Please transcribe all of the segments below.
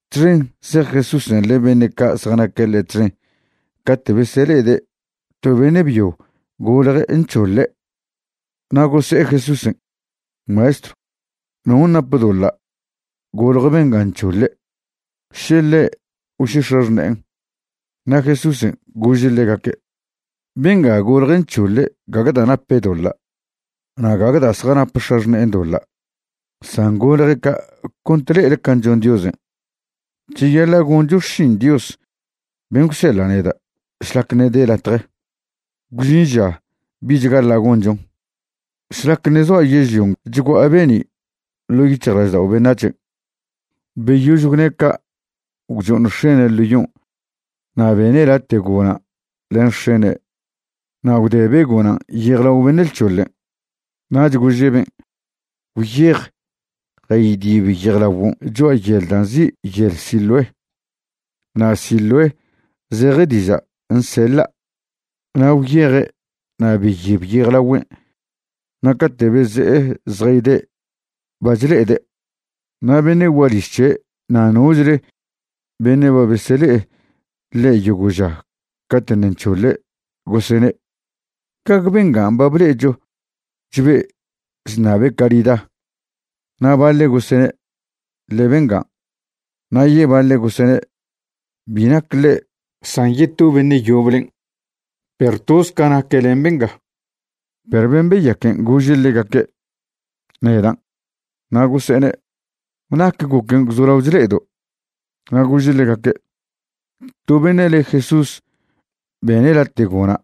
Txen zej Jesúsen' len beṉe' ca' zjanaque' ḻe' txen cate' besele'ede' to beṉe' byo golje' nc̱hoḻe'. Na' gose'e Jesúsen': ―Maestrw, ¿non' nap doḻa' golje benga nc̱hoḻe', še ḻe' o še x̱axṉe'en? Na' Jesúsen' gože' ḻegaque': ―Benga golje' nc̱hoḻe' gague da' nape' doḻa' na' gague da' zjanap x̱axṉe'en doḻa', san golje' ca' cont le'ele can' chon Diosen'. Cheyaḻa' goncho xšin Dios ben' gwseḻa' neda' šlac ṉe' de latje. Gwžin ža bich gaḻa' gonchon. Šlac ṉe' zoa' yežlion' chgua'a be'ni' ḻo' yic̱hjlaždao' beṉac̱hen'. Beyož gwne' ca' gwcho'oṉ x̱ene' ḻo yon' na' bene' late' gona' len x̱ene' na' gwdebe' gonan' yejlao beṉe' lc̱hoḻen'. Nach gože' ben': ―Gwyej jaydib yejlaguon' cho'a yel da' nzi' Yel Siloé. (Na' Siloé zeje diža' Nseḻa'.) Na' gwyeje' na' beyib yejlagüen' na' cate' beze'e zjayde' ba chle'ede'. Na' beṉe' gualiž c̱he' na' nochle beṉe' ba besele'e ḻe' yogo' ža cate' ṉe' nc̱hoḻen' gosene': ―¿Gague bengan' ba ble'echo chbe' chṉabe' carida? Na' baḻe' gosene': ―Ḻe bengan'. Na' yebaḻe' gosene': ―Bi nac ḻe' san yeto beṉe' yoblen', perw toz ca naque' len benga. Perw ben' beyaquen' gože' ḻegaque': ―Nedan'. Na' gose'ene': ―¿Nac goquen' gwzolao chle'edo'? Na' gože' ḻegaque': ―To beṉe' le Jesús bene' late' gona'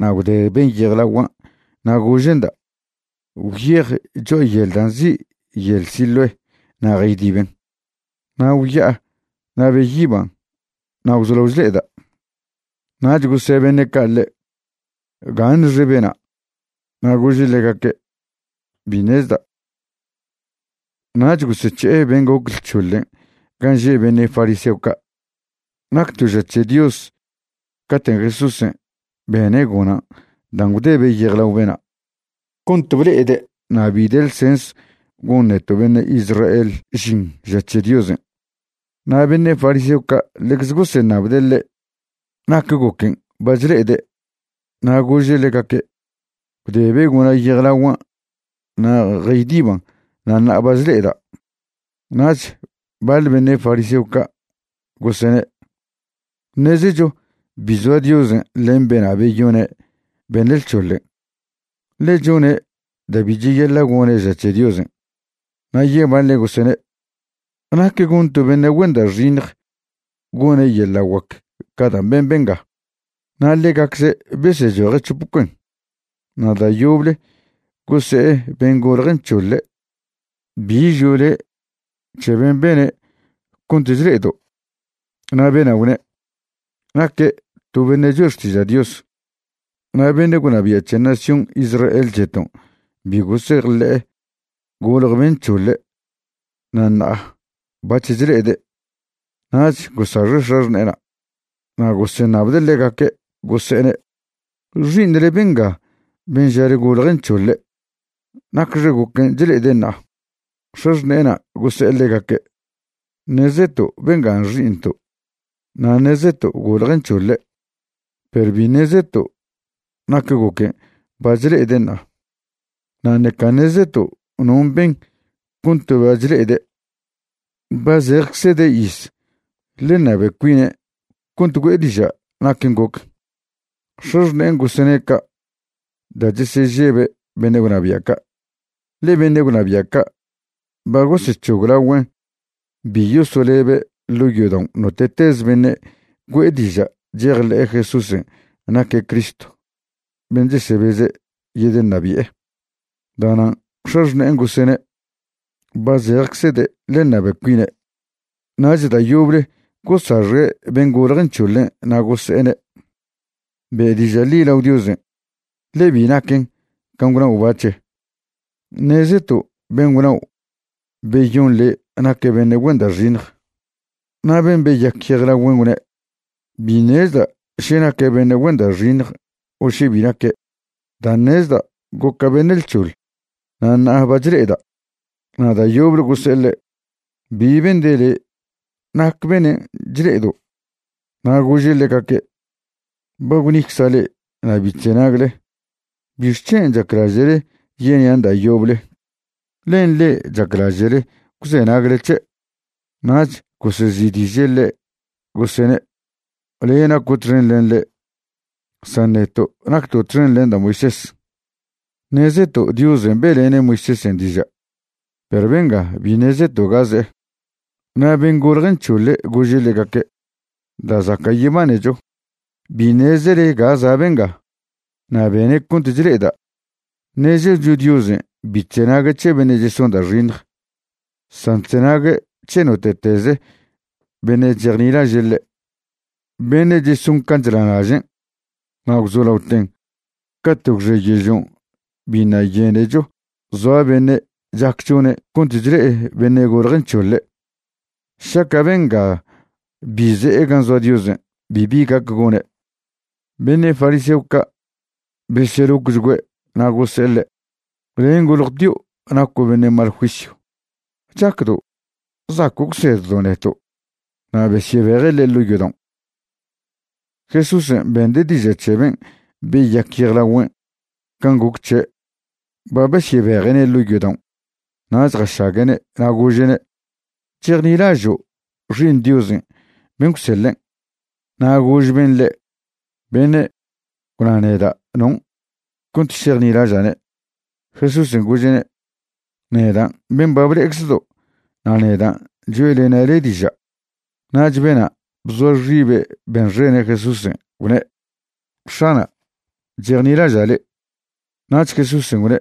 na' gwdeben' yejlaguan' na' gože'nda': “Gwyej cho'a yel da' nzi' Yel Siloé na' jaydiben'.” Na' gwya'a na' beyiban' na' gwzolao chle'eda'. Nach gose' beṉe' ca' ḻe': ―¿Gaṉxe bena'? Na' gože' ḻegaque': ―Bi ṉezda'. Nach gosec̱he'e ben' goc lc̱hoḻen' gan' že' beṉe' fariseo ca'. Nac to ža c̱he Dios caten' Jesúsen' bene' gonan' dan' gwdebe' yejlao bena' cont ble'ede' na' bi de ḻsens gon neto' beṉe' Israel žin ža c̱he Diosen'. Na' beṉe' fariseo ca' ḻecze goseṉabde' ḻe' nac goquen' ba chle'ede'. Na' gože' ḻegaque': ―Gwdebe' gona' yejlaguan' na' jaydiban' na' ṉa'a ba chle'eda'. Nach baḻ beṉe' fariseo ca' gosene': ―Ṉezecho bi zoa Diosen' len bena' beyone' beṉe' lc̱hoḻen', ḻe chone' da' bi cheyaḻa' gone' ža c̱he Diosen'. Na' yebaḻe' gosene': ―¿Nac gon to beṉe' güen da' xiṉj gone' yeḻa' guac ca dan' ben benga? Na' ḻegacze' besechoje' c̱hop cuen. Na' da' yoble gose'e ben' golje' nc̱hoḻe': ―¿Bi žo' le' c̱he ben' bene' cont chle'edo'? Na' bena' gwne': ―Naque' to beṉe' choe' xtiža' Dios. Na' beṉe' gwnabia' c̱he nación Israel c̱heton' bi gosejḻe'e golje ben' nc̱hoḻe' na' ṉa'a bac̱h chle'ede'. Nach gosaxe' x̱axṉe'ena'. Na' goseṉabde' ḻegaque', gose'ene': ―¿Xi'iṉle benga ben' žale golje' nc̱hoḻe'? ¿Nacxe goquen' chle'ede' ṉa'a? X̱axṉe'ena' gose'e ḻegaque': ―Ṉezeto' bengan' xi'iṉto', na' ṉezeto' golje' nc̱hoḻe'. Perw bi ṉezeto' nac goquen' ba chle'ede' ṉa'a, na' ṉeca ṉezeto' non' ben cont ba chle'ede'. Ba zejeczede' iz, ḻe ṉabe cuine' cont güe'e diža' naquen' goc. X̱axṉe'en gosene' ca' da' chesežebe' beṉe' gwnabia' ca', ḻe beṉe' gwnabia' ca' ba gosec̱hoglagüen' bi yosolebe' ḻo' yodaon' note'teze beṉe' güe'e diža' chejḻe'e Jesúsen' naque' Cristo ben' chesebeze' yedeṉabi'e. Da'nan' x̱axṉe'en gosene': “Ba zejeczede', ḻe ṉabe cuine'.” Nach da' yoble gosaxe' ben' golje' nc̱hoḻe' na' gose'ene': ―Be' diža' ḻi lao Diosen', ḻe bi naquen can' gwnao' bac̱he. Ṉezeto' ben' gwnao' beyon le' naque' beṉe' güen da' xiṉj. Na' ben' beyac yejlagüen' gwne': ―Bi ṉezda' še naque' beṉe' güen da' xiṉj o še bi naque'. Da' ṉezda', goca' beṉe' lc̱hoḻ na' ṉa'a ba chle'eda'. Na' da' yoble gose'e ḻe': ―¿Bi bende' le? ¿Nac benen' chle'edo'? Na' gože' ḻegaque': ―Ba gwnicza' le'e na' bi chzenagle. ¿Bixc̱hen' chaclaže'le yenian' da' yoble? ¿Len le'e chaclaže'le gwzenagle c̱he'? Nach gosezi'diže' ḻe', gosene': ―Le' naco' txen len ḻe', san neto' nacto' txen len da' Moisés. Ṉezeto' Diosen' be'lene' Moisésen' diža', perw benga bi ṉezeto' ga ze'e. Na' ben' golje' nc̱hoḻe' gože' ḻegaque': ―¡Da' zaca' yebanecho, bi ṉezele ga za' benga, na' bene' cont chle'eda'! Ṉezecho Diosen' bi chzenague' c̱he beṉe' cheson da' xiṉj, san chzenague' c̱he note'tez beṉe' chejnilaže' ḻe', beṉe' cheson can' chnalažen'. Na' gwzolaoten cate' gwxe yežlion' biṉa' yenecho zoa beṉe' chac chone' cont chle'e beṉe' golje' nc̱hoḻe'. Šaca' bengan' bi ze'e gan' zoa Diosen' bibi gac gone'. Beṉe' fariseo ca' beselocchgüe' na' gose'e ḻe': ―Len' goljtio' naco' beṉe' mal juisyw, ¿chacdo' zaco' gwseddo' neto'? Na' besyebeje' ḻe' ḻo' yodaon'. Jesúsen' bende' diža' c̱he ben' beyac yejlagüen' can' goc c̱he' ba besyebeje'ne' ḻo' yodaon' nach jašague'ne' na' gože'ne': ―¿Chejnilažo' Xi'iṉ Diosen' ben' gwseḻen'? Na' gož ben' ḻe': ―Beṉe', gwna neda' non', cont šejnilaža'ne'. Jesúsen' gože'ne': ―Nedan' ben' ba ble'eczedo' na' nedan' choe'lena' le' diža'. Nach bena' bzoa xibe' benxene' Jesúsen', gwne': ―X̱ana', chejnilaža' le'. Nach Jesúsen' gwne':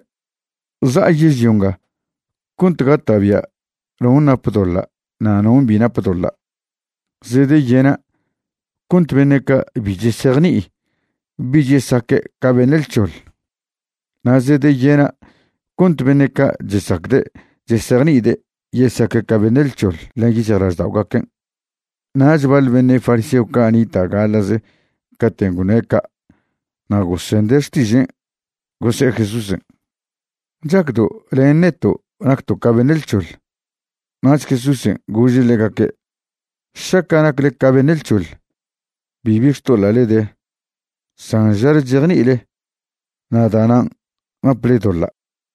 ―Za'a yežlio nga cont gata'bia' non' nap doḻa' na' non' bi nap doḻa'. Zedeyena' cont beṉe' ca' bi chesejni'i bich yesaque' ca beṉe' lc̱hoḻ, na' zedeyena' cont beṉe' ca' chesacde' chesejni'ide' yesaque' ca beṉe' lc̱hoḻ len yic̱hjlažda'ogaquen'. Nach baḻ beṉe' fariseo ca' nita' gaḻa'ze caten' gwne' ca' na' gosende' xtižen', gose'e Jesúsen': ―¿Chacdo' len neto' nacto' ca beṉe' lc̱hoḻ? Nach Jesúsen' gože' ḻegaque': ―Šaca' nacle ca beṉe' lc̱hoḻ, bibi xtoḻa'le de, san žale chejni'ile, na' da'nan' naple doḻa'.